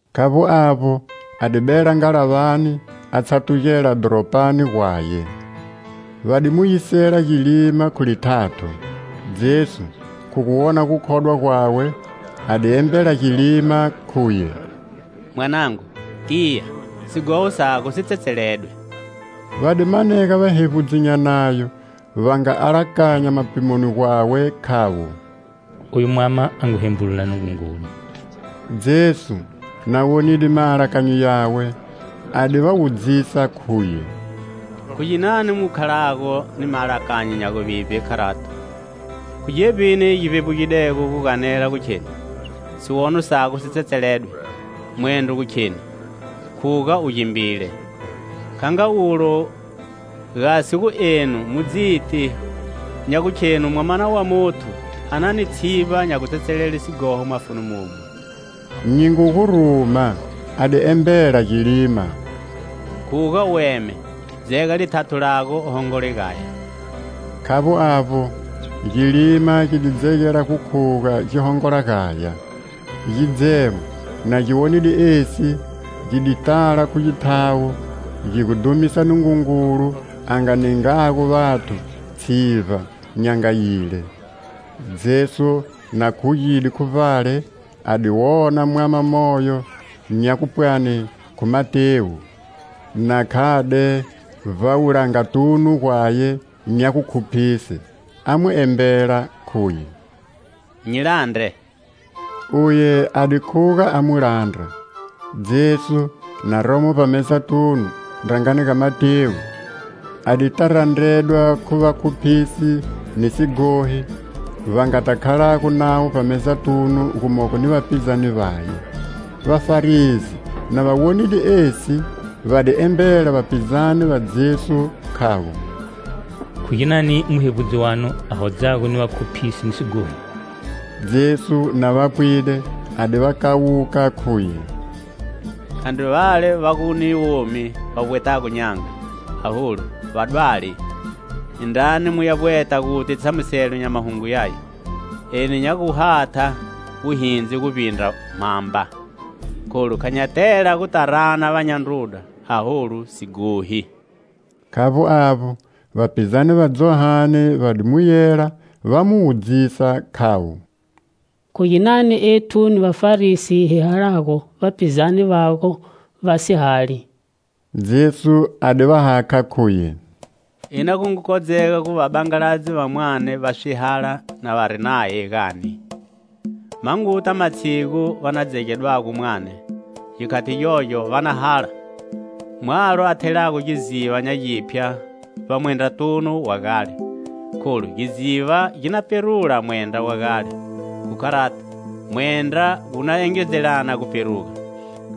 Khavbo avbo, a di bela ngalavani, a tshatugela dhoropani gwaye. Va di mu yisela gilima khu lithatho. Jesu, khu gu wona gukhodwa gwawe, a di embela gilima, khuye: "Mwanangu, tiya. Sighoho sago si tsetseledwe." Va di manega vahevbudzi nya Nayo va nga alakanya mapimoni gwawe, khavo: "Oyu mwama a ngu hembulula Nungungulu." Jesu, na wonide maalakanyo yawe, a di va wudzisa, khuye: "Khu ginani mu khalago ni maalakanyo nya guvivbe kharato? Khu gevbini gi vbevbugidego gu ganela gu kheni: 'Siwono sago si tsetseledwe,' mwendro gu kheni, 'Khuga u gimbile?' Kha nga ulo, gasi gu enu mu dziti nya gukhenu Mwamana wa Muthu a na ni tshivba nya gutsetselele sighoho mafuni momu, nyi ngu gu ruma - a di embela gilima – khuga u eme, dzega lithatho lago u hongola gaya." Khavbo avbo, gilima gi di dzegela gu khuga gi hongola gaya. Gidzemo, na gi wonide esi, gi di tala khu githawo, gi gu dhumisa Nungungulu a nga ningago vathu tshivba nya nga yile. Jesu na khugide khu vbale, a di wona mwama moyo nya gupwani khu Matewu, na khade vbawulangatunu gwaye nya gukhuphise, a mu embela, khuye: "Nyi landre!" Uye a di khuga a mu landra. Jesu, na romo vbamezatunu, ndrangani ga Matewu, a dita randredwa khu vakhuphisi ni sighohi, va ngata khalago navo vbamezatunu gumogo ni vapizane vaye. Vafarisi na va wonide esi, va di embela vapizane va Jesu, khavo: "Khu ginani muhevbudzi wanu a hodzago ni vakhuphisi ni sighohi?" Jesu, na va pwide, a di va kawuka, khuye: "Khandri vale va gu ni womi va vbwetago n'yanga, aholu, vadwali. Indrani mu ya vbweta guti tshamuselo nya mahungo yaya: 'Eni nya gu hatha wuhindzi guvbindra mhamba.' Kholu kha nya tela guta rana vanya ndruda, aholu, sighohi." Khavbo avbo, vapizane va Johane va di mu yela va mu wudzisa khavo: "Khu ginani ethu ni Vafarisi hi halago, vapizane vago vasi hali?" Jesu a di va hakha, khuye: "Ina gu ngu kodzega gu vabangaladzi va mwane va swihala na vari naye, gani? Ma nguta matshigu va na gu dzegedwago mwane. Gikhati gyogyo va na hala!" "Mwalo a thelago giziva nya giphya vbamwendratunu wa gale, kholu giziva gi na pferula mwendra wa gale. Khu kharato, mwendra wu na engedzelana gu pferuga.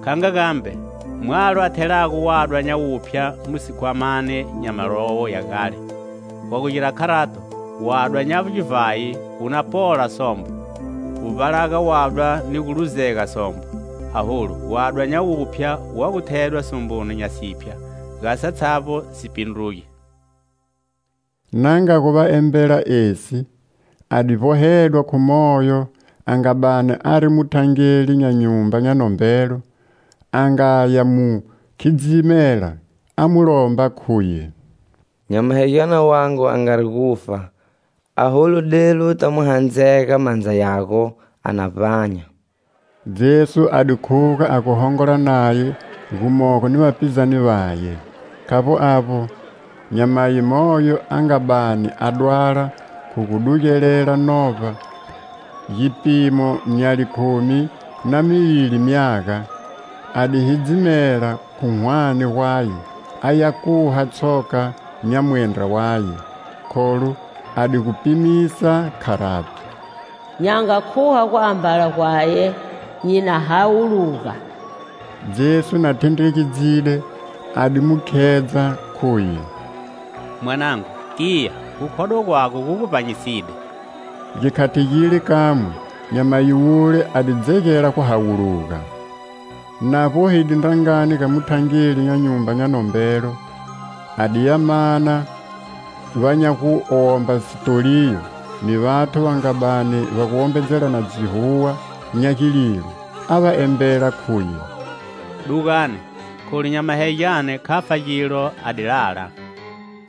Kha nga gambe, mwalo a thelago wadwa nya wuphya mu sikhwamani nya malowo ya gale. Wa gu gira kharato, wadwa nya givhayi wu na pola sombo. Wu vbalaga wadwa ni gu luzega sombo. Aholu wadwa nya wuphya wa gu thedwa somboni nya siphya, gasi satshavbo si pindruge." Na nga gu va embela esi, a di vbohedwa khu moyo a nga bani ari muthangeli nya nyumba nya nombelo, a nga ya mu khidzimela, a mu lomba khuye: "Nyamahegyane wangu a ngari gufa, aholu delu uta mu handzega mandza yago, a na vbanya." Jesu a di khuga a gu hongola naye gumogo ni vapizane vaye. Khavbo avbo, nyamayi moyo a nga bani a dwala khu gu dugelela novba gipimo nya likhumi na mivili myaga, a di hidzimela khu hwane gwaye aya kuha tshoka nya mwendra waye. Kholu a di gu pimisa kharati: "Nya nga kuha guambala gwaye, nyi na hawuluga." Jesu na thendregedzide, a di mu khedza, khuye: "Mwanangu, tiya, gukhodwa gwago gu gu vbanyiside." Gikhati gile kamwe, nyamayi wule a di dzegela gu hawuluga. Na vbohide ndrangani ga muthangeli nya nyumba nya nombelo, a di ya mana va nya gu womba sitoliyo ni vathu va nga bani va wombedzelana dzihuwa nya gililo, a va embela, khuye: "Dugani, kholu nyamahegyane kha fa gilo, a di lala."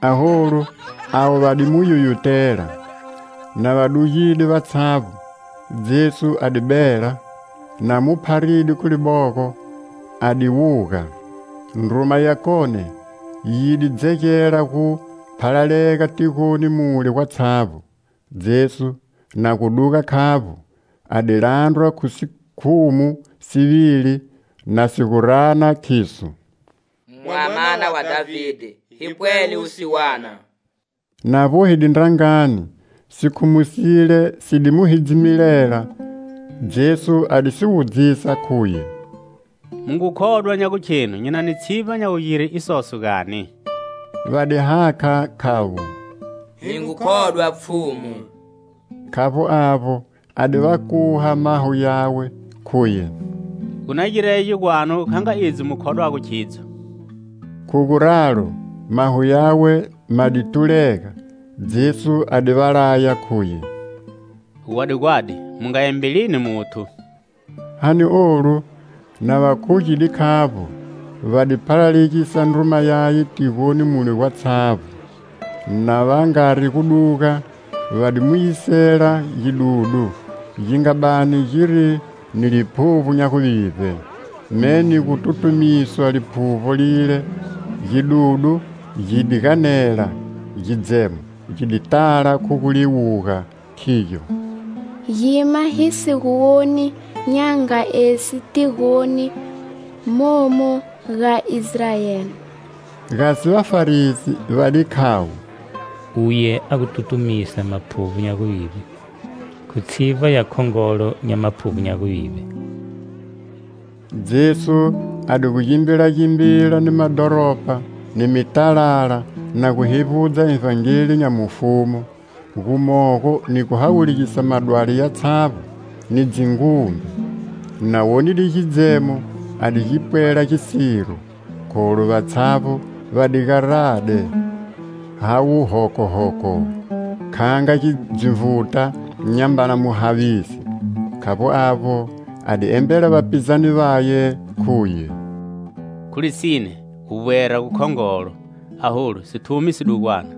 Aholu avo va di mu yuyutela. Na va dugide vatshavbo, Jesu a di bela. Na mu pharide khu libogo, a di wuga. Ndruma yakone yi di dzegela gu phalalega tigoni mule gwatshavbo. Jesu, na gu duga khavbo, a di landrwa khu sikhumu sivili na si gu rana, khiso: "Mwamana wa Dhavide, hi pwele wusiwana." Na vbohide ndrangani, sikhumu sile si di mu hidzimelela. Jesu a di si wudzisa, khuye: "Mu ngu khodwa nya gukhenu nyi na ni tshivba nya gugire isoso, gani?" Va di hakha, khavo: "Hi ngu khodwa, Pfhumu." Khavbo avbo, a di va kuha maho yawe, khuye: "Gu na girege gwanu kha nga idzo mu khodwago khidzo." Khu kharalo, maho yawe ma di, tulega. Jesu a di va laya, khuye: "Gwadi - gwadi, mu nga embelini muthu." Gani olu, na va khugide khavbo, va di phalalegisa ndruma yaye tigoni mule gwatshavbo. Na va ngari gu duga, va di mu yisela gidudu, gi nga bani giri ni liphuvbo nya guvivbe. Me ni gu tutumiswa liphuvbo lile, gidudu gi di ganela. Gidzemo gi di tala khu guliwuga, khigyo: "Gima hi si gu woni nya nga esi tigoni momu ga Israeli." Gasi Vafarisi va di khavo: "Uye a gu tutumisa maphuvbo nya guvivbe khu tshivba ya khongolo nya maphuvbo nya guvivbe." Jesu a di gu gimbilagimbila ni madhoropa ni mitalala, na gu hevbudza Ivhangeli nya mufumu, gumogo ni gu hawulugisa madwali yatshavbo ni dzingumbe. Na wonide gidzemo, a di gi pwela gisiro, kholu vatshavbo va di garade havo hoko-hoko, kha nga dzinvuta nyambana muhavisi. Khavbo avbo, a di embela vapizane vaye, khuye: "Khu lisine, guvbwera gukhongolo! Aholu, sithumi sidugwana.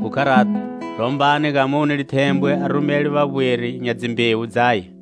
Khu kharato, lombani ga mune lithembwe a rumele vavbweri nya dzimbewu dzaye."